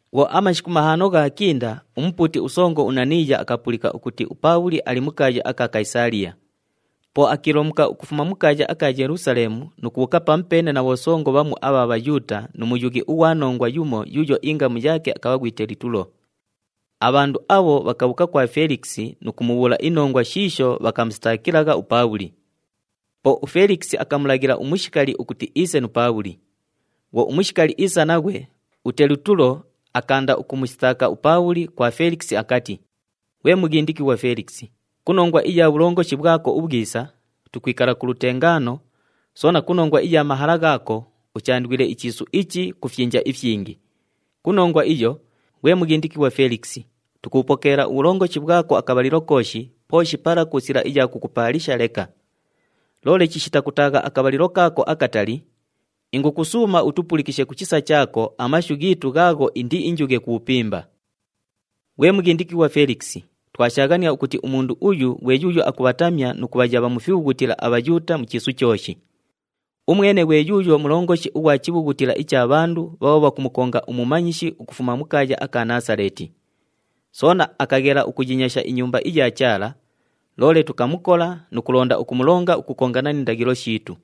Bhwo amashiku mahaano ghaakinda, umupuuti usongo uNaniiya akapulika ukuti uPaabhuli ali mu kaaya aka Kayisaaliya. Po akiilomuka ukufuma mu kaaya aka Yelusaleemu nu kubhuuka pamupeene na bhosongo bhamu abha Bhayuuta, nu muyughi ughwa nongwa yumo, yuuyo ingamu yaake akabha ghwi Telitulo. Abhandu abho bhakabhuuka kwa Felikisi nu kumubhuula inongwa shiisho bhakamusitaakilagha uPaabhuli. Po uFelikisi akamulaghila umushikali ukuti iise nu Paabhuli. Bhwo umushikali iisa naghwe, uTelitulo akaanda ukumusitaaka uPaabhuli kwa Felikisi akati, “Ghwe mughindikighwa Felikisi, ku nongwa iya bhulongoshi bhwako ubhwisa, tukwikala ku lutengaano, soona ku nongwa iya mahala ghaako, uchaandwile ichiisu ichi ku fyinja ifyingi. Ku nongwa iyo, ghwe mughindikighwa Felikisi, tukubhupokeela ubhulongoshi bhwako akabhalilo kooshi, pooshi pala ku sila iya kukupaalisha leka. Loole chishita kutaagha akabhalilo kaako akatali, ingukusuuma utupulikishe ku chisa chaako amashu ghiitu ghaagho indiinjughe ku bhupimba. “Ghwe mughindikighwa Felikisi, twashaaghania ukuti umundu uyu ghwe yuuyo akubhatamya nu kubhayabha mu fibhughutila aBhayuuta mu chiisu chooshi. Umwene ghwe yuuyo mulongoshi ughwa chibhughutila icha bhandu bhaabho bhakumukonga umumanyishi ukufuma mu kaaya aka Naasaleeti. Soona akaghela ukuyinyasha iNyumba iya Chaala, loole tukamukola [nu kulonda ukumulonga ukukongana ni ndaghilo shiitu.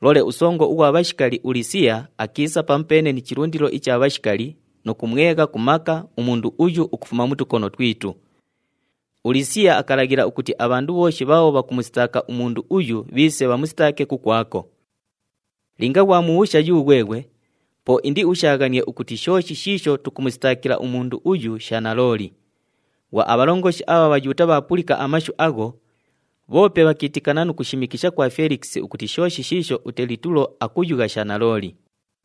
Loole usongo ughwa bhashikali uLisiya akiisa pamupeene ni chilundilo icha bhashikali nu kumwegha ku maka umundu uyu ukufuma mu tukono twitu. ULisiya akalaghila ukuti abhandu bhooshi bhaabho bhakumusitaaka umundu uyu bhiise bhamusitaake kukwako]. Linga ghwamubhuusha yughweghwe, po indiushaaghanie ukuti shooshi shiisho tukumusitaakila umundu uyu sha nalooli.” Bhwo abhalongoshi abha Bhayuuta bhaapulika amashu agho, bhoope bhakiitikana nu kushimikisha kwa Felikisi ukuti shooshi shiisho uTelitulo akuyugha sha nalooli.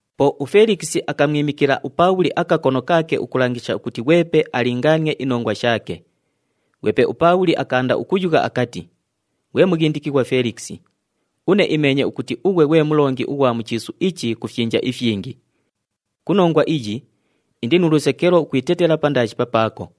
Po uFelikisi akamwimikila uPaabhuli akakono kaake ukulangisha ukuti ghwepe alingaanie inongwa shaake. Ghwepe uPaabhuli akaanda ukuyugha akati, “Ghwe mughindikighwa Felikisi, une imeenye ukuti ughwe ghwe mulongi ughwa mu chiisu ichi ku fyinja ifyingi. Ku nongwa iyi, indi nu lusekelo ukwitetela pandaashi papaako.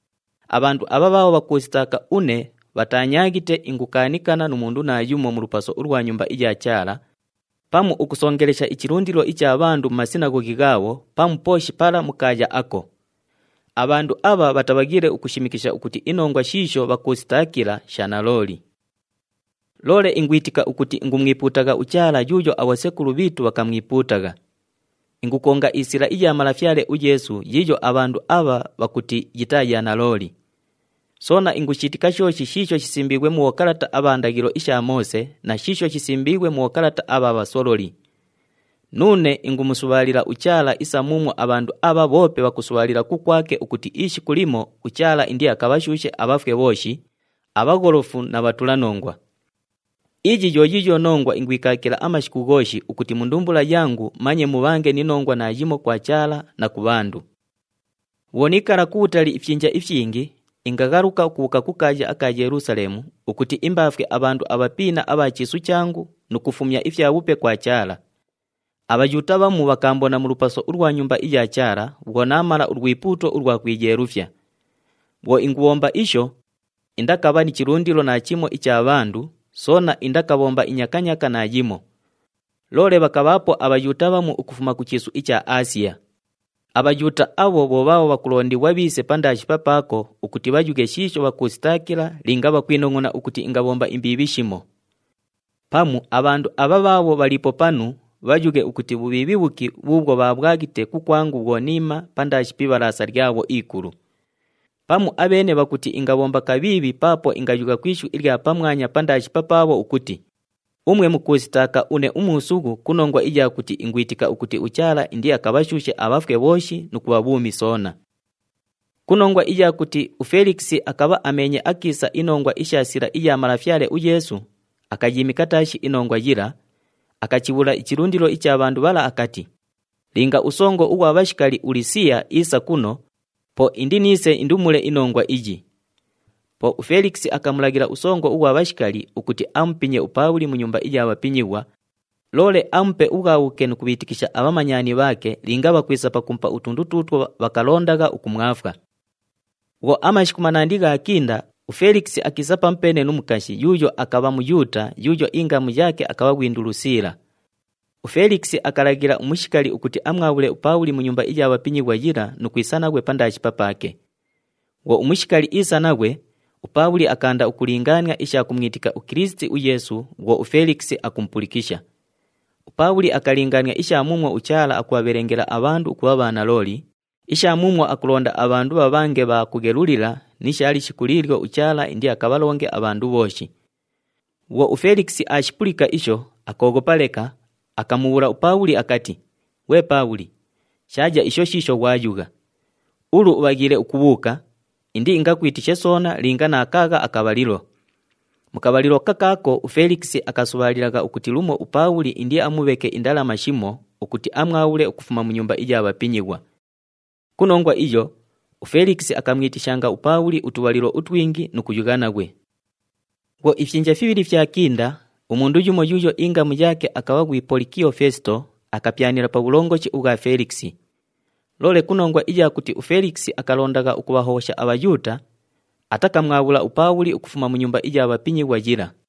Abhandu abha bhaabho bhakuusitaaka une bhataanyaaghite ingukaanikana nu mundu naayumo mu lupaso ulwa Nyumba iya Chaala, pamu ukusongelesha ichilundilo icha bhandu mu masinaghoghi ghaabho pamu pooshi pala mu kaaya ako. Abhandu abha bhatabhaghiile ukushimikisha ukuti inongwa shiisho bhakuusitaakila sha nalooli. “Loole ingwitika ukuti ingumwipuutagha uChaala yuuyo abhosekulu bhiitu bhakamwipuutagha. Ingukonga iSila iya Malafyale uYeesu yiiyo abhandu abha bhakuti yitaa ya nalooli. Soona ingushiitika shooshi shiisho shisimbiighwe mu bhokalata abha ndaghilo isha Moose na shiisho shisimbiighwe mu bhokalata abha bhasololi. Nuune ingumusubhaalila uChaala isa muumwo abhandu abha bhoope bhakusubhaalila kukwake ukuti ishiku limo uChaala indiakabhashuushe abhafwe bhooshi, abhagholofu na bhatulanongwa. Iyi yo yiiyo nongwa ingwikaakila amashiku ghooshi ukuti mu ndumbula yangu manye mubhange ni nongwa naayimo kwa Chaala na ku bhandu. “Bhwo niikala kubhutali ifyinja ifyingi, ingaghaluka ukubhuuka ku kaaya aka Yelusaleemu ukuti imbaafwe abhandu abhapiina abha chiisu changu nu kufumya ifyabhupe kwa Chaala. ABhayuuta bhamu bhakaambona mu lupaso ulwa Nyumba iya Chaala bhwo naamala ulwipuuto ulwa kwiyeelufya. Bhwo ingubhomba isho, indakabha ni chilundilo naachimo icha bhandu, soona indakabhomba inyakanyaaka naayimo. Loole bhakabhaapo aBhayuuta bhamu ukufuma ku chiisu icha Aasiya. ABhayuuta abho bho bhaabho bhakulondighwa bhiise pandaashi papaako ukuti bhayughe shiisho bhakuusitaakila linga bhakwinongʼona ukuti ingabhomba imbiibhi shimo. Pamu abhandu abha bhaabho bhaliipo panu bhayughe, ukuti bhubhiibhi bhuki bhuubhwo bhaabhwaghite kukwangu bhwo niima pandaashi pi Ibhalaasa lyabho ikulu. Pamu abheene bhakuti ingabhomba kabhiibhi paapo ingayugha ku ishu ilya pamwanya pandaashi papaabho ukuti, ‘Umwe mukuusitaaka une umuusughu ku nongwa iya kuti ingwitika ukuti uChaala indiakabhashuushe abhafwe bhooshi nu kubha bhuumi soona.’” Ku nongwa iya kuti uFelikisi akabha ameenye akiisa inongwa isha Sila iya Malafyale uYeesu, akayiimika taashi inongwa yila, akachibhuula ichilundilo icha bhandu bhala akati, “Linga usongo ughwa bhashikali uLisiya iisa kuno, po indiniise indumule inongwa iyi.” Po uFelikisi akamulaghila usongo ughwa bhashikali ukuti amupinye uPaabhuli mu nyumba iya bhapinyighwa, loole amupe ubhwabhuke nu kubhiitikisha abhamanyani bhaake linga bhakwisa pakumupa utundu tuutwo bhakalondagha ukumwafwa. Bhwo amashiku manandi ghaakinda, uFelikisi akiisa pamupeene nu mukashi yuuyo akabha Muyuuta yuuyo ingamu yaake akabha ghwi Ndulusiila. UFelikisi akalaghila umushikali ukuti amwabhule uPaabhuli mu nyumba iya bhapinyighwa yila nu kwisa naghwe pandaashi papaake. Bhwo umushikali iisa naghwe, uPaabhuli akaanda ukulingaania isha kumwitika uKilisiti uYeesu bhwo uFelikisi akumupulikisha. UPaabhuli akalingaania isha muumwo uChaala akubhabhelengela abhandu ukubha bhanalooli, isha muumwo akulonda abhandu bhabhange bha kughelulila ni sha lishiku liilyo uChaala indiakabhalonge abhandu bhooshi. Bhwo uFelikisi aashipulika isho, akooghopa leka, akamubhuula uPaabhuli akati, “Ghwe Paabhuli, shaaya isho shiisho ghwayugha! Ulu ubhaghiile ukubhuuka, indiingakwitishe soona linga naakaagha akabhalilo.” Mu kabhalilo kakaako uFelikisi akasubhaalilagha ukuti lumo uPaabhuli indiamubheke indalama shimo ukuti amwabhule ukufuma mu nyumba iya bhapinyighwa. Ku nongwa iyo, uFelikisi akamwitishanga uPaabhuli utubhalilo utwingi nu kuyugha naghwe. Bhwo ifyinja fibhili fyakinda, umundu yumo yuuyo ingamu yaake akabha ghwi Polikiyo Feesito akapyanila pa bhulongoshi ubhwa Felikisi. Loole ku nongwa iya kuti uFelikisi akalondagha ukubhahobhosha aBhayuuta, atakamwabhula uPaabhuli ukufuma mu nyumba iya bhapinyighwa yila.